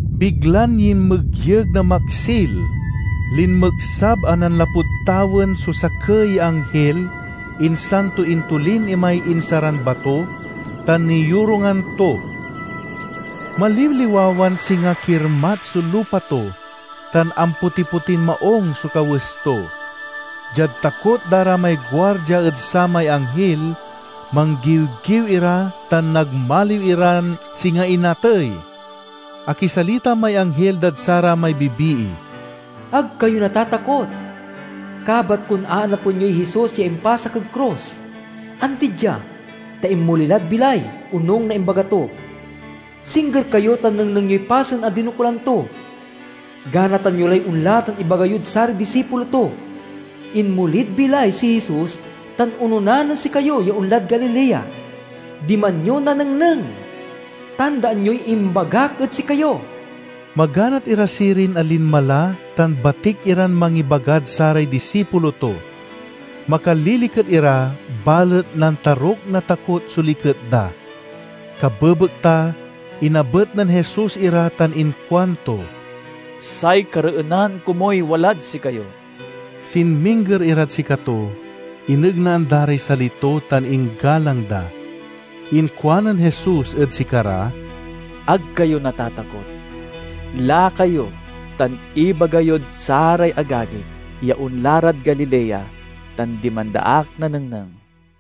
Biglan yinmegyeg na maksil. Linmeksab a nanlapud tawen so sakey ya anghil, insan to intolin imay insaran bato, tan niyorungan to. Maliwliwawan singa kirmat so lupa to, tan ampotipotin maung so kawes to. Diad takot da ra may guardia ed samay anghil, manggiwgiw ira tan nagmaliw iran singa inatey. Akisalita may anghil dad saramay bibii, "Ag kayo natatakot. Kabat kon aanapen yoy Jesus ya impasak ed krus. Andi dia, ta inmoli lad bilay, onung na imbaga to. Singger kayo tan nengneng yoy pasen a dinokulan to. Ganatan yo lay onla tan ibaga yod saray disipulo to, 'Inmolid bilay si Jesus tan onona nen sikayo ya onlad Galilea. Diman yo nanengneng!' Tandaan yoy imbagak ed sikayo" Maganat ira sirin a linma la tan batik iran mangibagad saray disipulo to. Makaliliket ira, balet nantaruk na takot so liket da. Kabebekta inabet nen Jesus ira tan inkuanto, "Say kareenan komuy walad sikayo!" Sinmingger irad sikato, inegnaan da ray sali to tan inggalang da. Inkuanen Jesus ed sikara, "Ag kayo natatakot. Laka yo tan ibaga yod saray agagik ya onla rad Galilea, tan diman da ak nanengneng."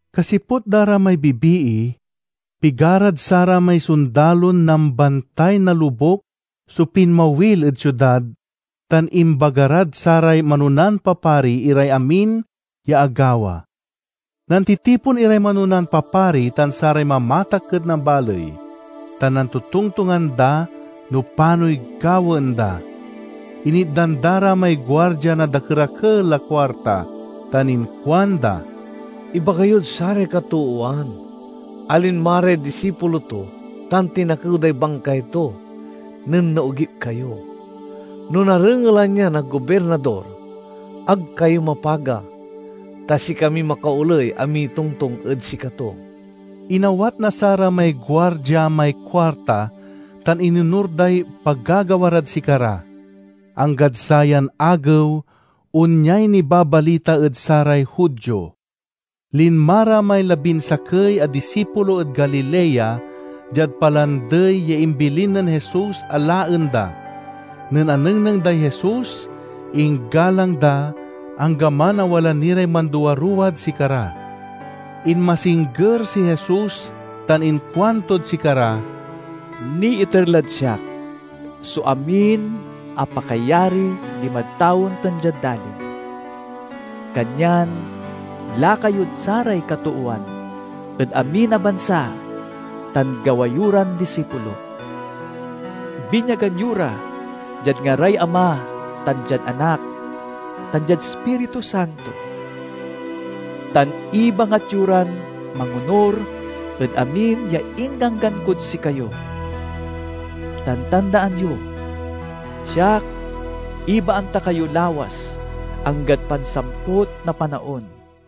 Kasiput da ra may bibii, pigarad saramay sondalon nambantay na lobuk so pinmawil ed siudad, tan imbaga rad saray manonan papari iray amin ya agawa. Nantitipon iray manonan papari tan saray mamatakken na baley, tan nantotongtongan da no panoy gawaen da. Initdan da ra may guardia na dakerakel a kuarta tan inkuanda, "Ibaga yod saray katoowan a linma ray disipulo to tan tinakew day bangkay to, nen naogip kayo. No narengelan ya na Gobirnador, ag kayo mapaga, ta sikamiy makaoley a mitongtong ed sikato." Inawat na saramay guardia may kuarta, tan inonur day pagagawa rad sikara. Anggad sayan agew, onyay nibabalita ed saray Judio. Linma ra may labinsakey a disipulo ed Galilea, diad palandey ya imbilin nen Jesus a laen da. Nen anengneng day Jesus inggalang da, anggaman a wala ni ray manduaruwad sikara. Inmasingger si Jesus tan inkuantod sikara, "Niiter lad siak so amin a pakayari dimad tawen tan diad dalin. Kanyan, laka yod saray katoowan ed amin a bansa tan gawa yo ran disipulok. Binyagan yo ra diad ngaray Ama tan diad Anak tan diad Ispiritu Santo, tan ibangat yo ran mangonur ed amin ya ingganggan kod sikayo. Tan tandaan yo! Siak, ibaan ta kayo lawas anggad pansamput na panaon."